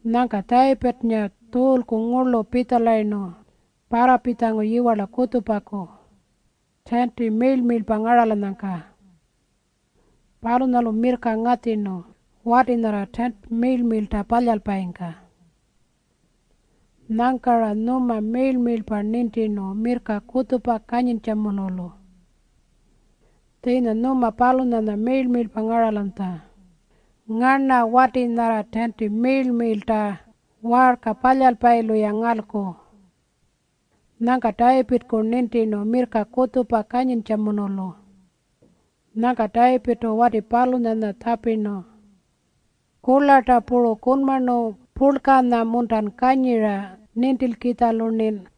Nyangka Tayipirrnga Tjuulku ngurlu pitjalayirnu parrapitjangu yiwarla kutjupaku, tiinti miirl-miirlpa ngaralanyangka. Palunyalu mirrka ngatjirnu wati nyarra tiinti miirl-miirlta palyalpayingka. Nyangka-ra nyuma miirl-miirlpa nintirnu mirrka kutjupa kanyintjamunulu. Tjiinya nyuma palunyanya miirl-miirlpa ngaralanytja. Ngarna wati nyarra tiinti miirl-miirlta waarka palyalpayilu-ya ngalku. Nyangka Tayipirrku nintirnu mirrka kutjupa kanyintjamunulu. Nyangka Tayipirrtu wati palunyanya tjapirnu, “Kurlarta puru kunmarnu purlkanya-muntan kanyira nintilkitjalu-rnin?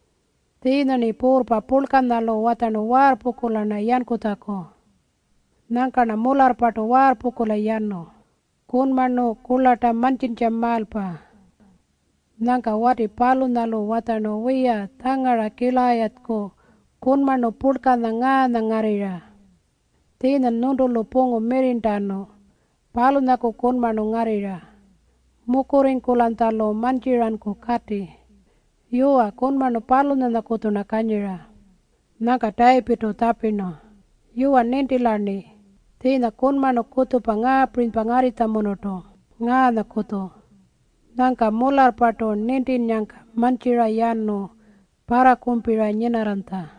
Tjiinya-rni puurrpa purlkanyalu watjarnu waarrpungkula-rna yankutjaku. Nyangka-rna mularrpartu waarrpungkula yanu, kunmarnu kurlarta mantjintjamaalpa.” Nyangka wati palunyalu watjarnu, “Wiya, tjangara Kilayatjaku kunmarnu purlkanya ngaanya ngarrirra. Tjiinyan nyuntulu pungu mirrirntanu, palunyaku kunmarnu ngarrirra. Mukurringkulanytjalu mantjiranku kati. Yuwa, kunmarnu palunyanyakutju-rna kanyira.” Nyangka Tayipirrtu tjapirnu, “Yuwa, nintila-rni. Tjiinya kunmarnu kutjupa ngaapirinypa ngarrinytjamunurtu, ngaanyakutju.” Nyangka mularrpartu nintinnyangka mantjira yanu parrakumpira nyinarranytja.